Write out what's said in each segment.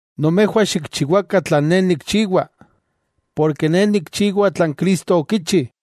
Nomejwah xikchiwakah tlan ne nikchiwa, porke ne nikchiwa tlan Cristo okichi.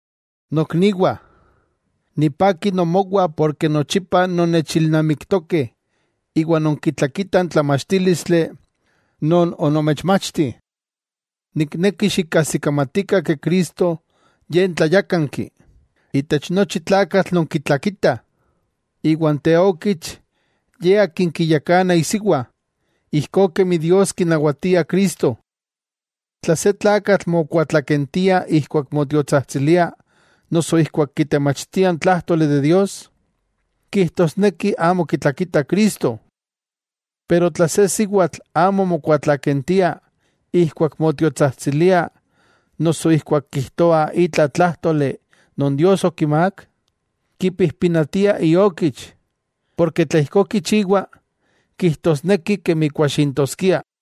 Nokniwah, nipaki nomowah porke nochipa nonnechilnamiktokeh iwa nonkitlakitah n tlamachtílistli non onomechmachti. Nikneki xikajsikamatikah Cristo Ye n tlayákanki, itech nochi tlakatl non kitlakita. Iwa n teokich ye akin kiyakana isiwa, ijkó kemi Dios kinawatia Cristo. Tla se tlakatl mokuatlakentia ijkuak motiotsajtsilia noso ijkuak kitemachtia n Tlájtoli de Dios, kijtosneki amo kitlakita Cristo. Pero tla se siwatl amo mokuatlakentia ijkuak motiotsajtsilia noso ijkuak kijtoa itla tlájtoli non Dios okimák, kipijpinatia iokich, porke tla ijkó kichiwa kijtosneki kemi kuaxintoskia.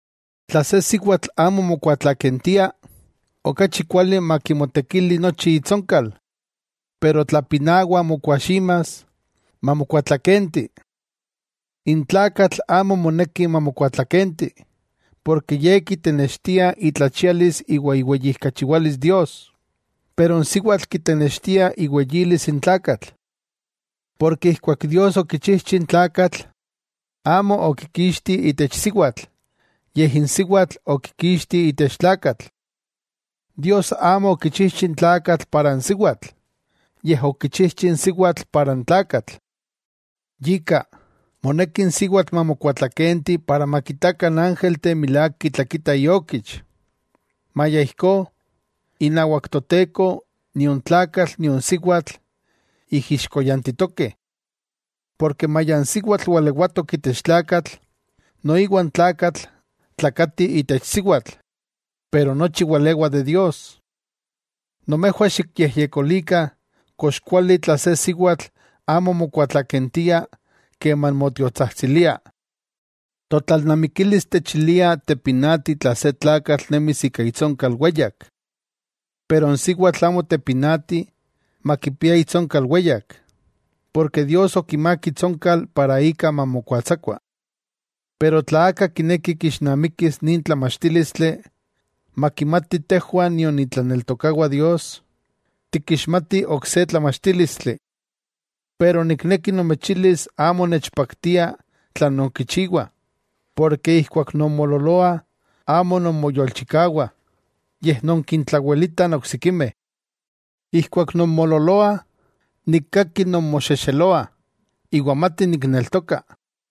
Tla se siwatl amo mokuatlakentia, okachi kuali makimotekili nochi itsonkal. Pero tla pinawa mokuaximas, mamokuatlakenti. N tlakatl amo moneki mamokuatlakenti, porke ye kitenextia itlachialis iwa iweyijkachiwalis Dios. Pero n siwatl kitenextia iweyilis n tlakatl. Porke ijkuak Dios okichijchi n tlakatl, amo okikixti itech siwatl, yej n siwatl, okikixti itech tlakatl. Dios amo okichijchi n tlakatl para n siwatl, yej okichijchi n siwatl para n tlakatl. Yika, moneki n siwatl mamokuatlakenti para makitakah n ángelteh milák kitlakita iokich. Maya ijkó, inawak Toteko nion tlakatl nion siwatl ijixkoyantitokeh. Porke maya n siwatl walewatok itech tlakatl, noiwa n tlakatl tlakati itech siwatl. Pero nochi walewa de Dios. Nomejwah xikyejyekolikah kox kuali tla se siwatl amo mokuatlakentia keman motiotsajtsilia. Totlalnamikilis techilia tepinati tla se tlakatl nemis ika itsonkal weyak. Pero n siwatl amo tepinati makipia itsonkal weyak, porke Dios okimák itsonkal para ika mamokuatsakua. Pero tla aka kineki kixnamikis nin tlamachtílistli, makimati tejwah nion itlaneltokawah Dios, tikixmatih ok se tlamachtílistli. Ne nikneki nomechilis amo nechpaktia tlan nonkichiwah, porke ijkuak nonmoololoah amo nonmoyolchikawah, yej nonkintlawelitah n oksikimeh. Ijkuak nonmoololoah, nikkaki nonmoxexeloah, iwa mati nikneltoka.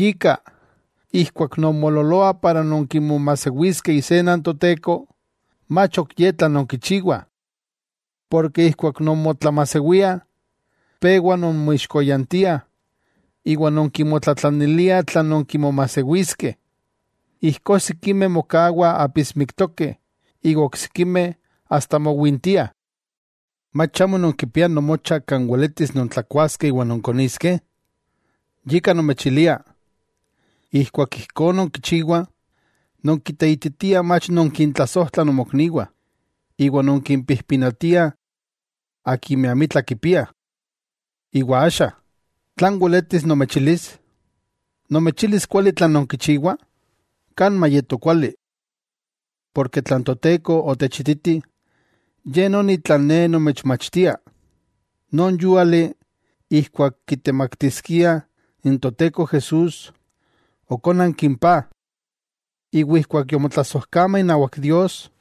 Yika, ijkuak nonmoololoah para nonkimomajsewiskeh isena n Toteko, mach ok ye tlan nonkichiwah. Porke ijkuak nonmotlamajsewiah, pewa nonmoijixkoyantiah iwa nonkimotlatlaniliah tlan nonkimomajsewiskeh. Ijkó sikimeh mokawah apismiktokeh iwa oksikimeh asta mowintiah. ¿Mach amo nonkipiah nomocha kan weletis nontlakuaskeh iwa nonkoniskeh? Yika nomechilia, ijkuak ijkó nonkichiwah, nonkiteititiah mach nonkintlasojtlah nomokniwah, iwa nonkimpijpinatiah akimeh amitla kipiah. Iwa axa, ¿tlan weletis nomechilis? ¿Nomechilis kuali tlan nonkichiwah? ¡Kan mayeto kuali! Porke tlan Toteko otechititi, ye noni tlan ne nomechmachtia: Non yúali ijkuak kitemaktiskiah n Toteko Jesús, okónanki n paj, iwa ijkuak yomotlasojkama inawak Dios,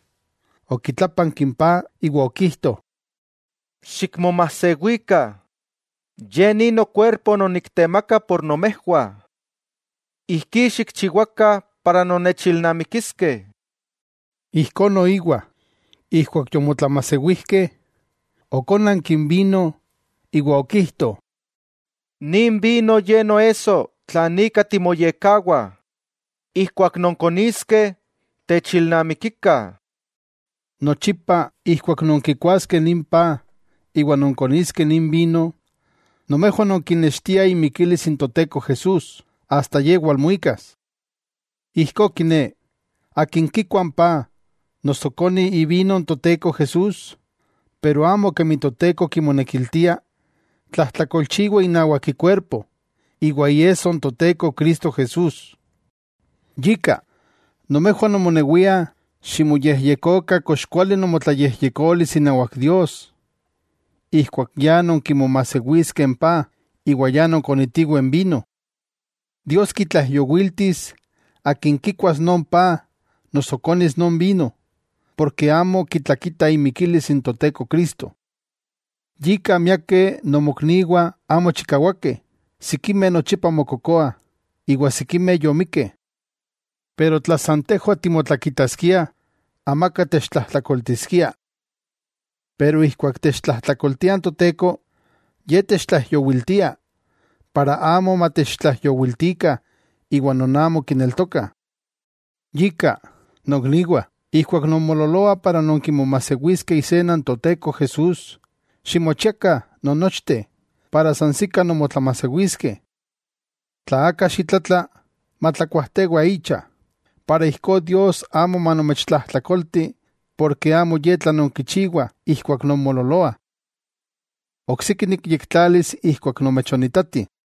okitlápanki n paj iwa okijto: “Xikmomajsewikah; Ye ni nokuerpo non niktemaka por nomejwah. Ijkí xikchiwakah para nonnechilnamikiskeh.” Ijkó noiwa, ijkuak yomotlamajsewijkeh, okónanki n vino iwa okijto: “Nin vino ye noesso tlan ika timoyekkawah, ijkuak nonkoniskeh, techilnamikikah.” Nochipa ijkuak nonkikuaskeh nin paj iwa nonkoniskeh nin vino, nomejwah nonkinextiah imikilis n Toteko Jesús, asta Ye walmuikas. Ijkó kiné, akin kikua n paj noso koni ivino n Toteko Jesús, pero amo kemi Toteko kimonekiltia, tlajtlakolchiwa inawak ikuerpo iwa iesso n Toteko Cristo Jesús. Yika, nomejwah nomonewiah ximoyejyekokah kox kuali nomotlayejyekolis inawak Dios ijkuak ya nonkimomajsewiskeh n paj iwa ya nonkonitiweh n vino. Dios kitlaijyowiltis akin kikuas non paj noso konis non vino, porke amo kitlakita imikilis n Toteko Cristo. Yika miakeh nomokniwah amo chikawakeh, sikimeh nochipa mokokoah, iwa sikimeh yomikkeh. Pero tla san tejwah timotlakitaskiah, amaka techtlajtlakoltiskia. Pero ijkuak techtlajtlakoltia n Toteko, Ye techtlaijyowiltiah, para amo matechtlaijyowiltikah iwa non amo kineltokah. Yika, nokniwah, ijkuak nonmoololoah para nonkimomajsewiskeh isena n Toteko Jesús, ximochiakah non nochteh para sansikah nonmotlamajsewiskeh. Tla aka xitlatla, matlakuajtewa icha, para ijkó Dios amo manomechtlajtlakolti porke amo ye tlan nonkichiwah ijkuak nonmoololoah. Oksiki nikyektlalis ijkuak nomechonitati.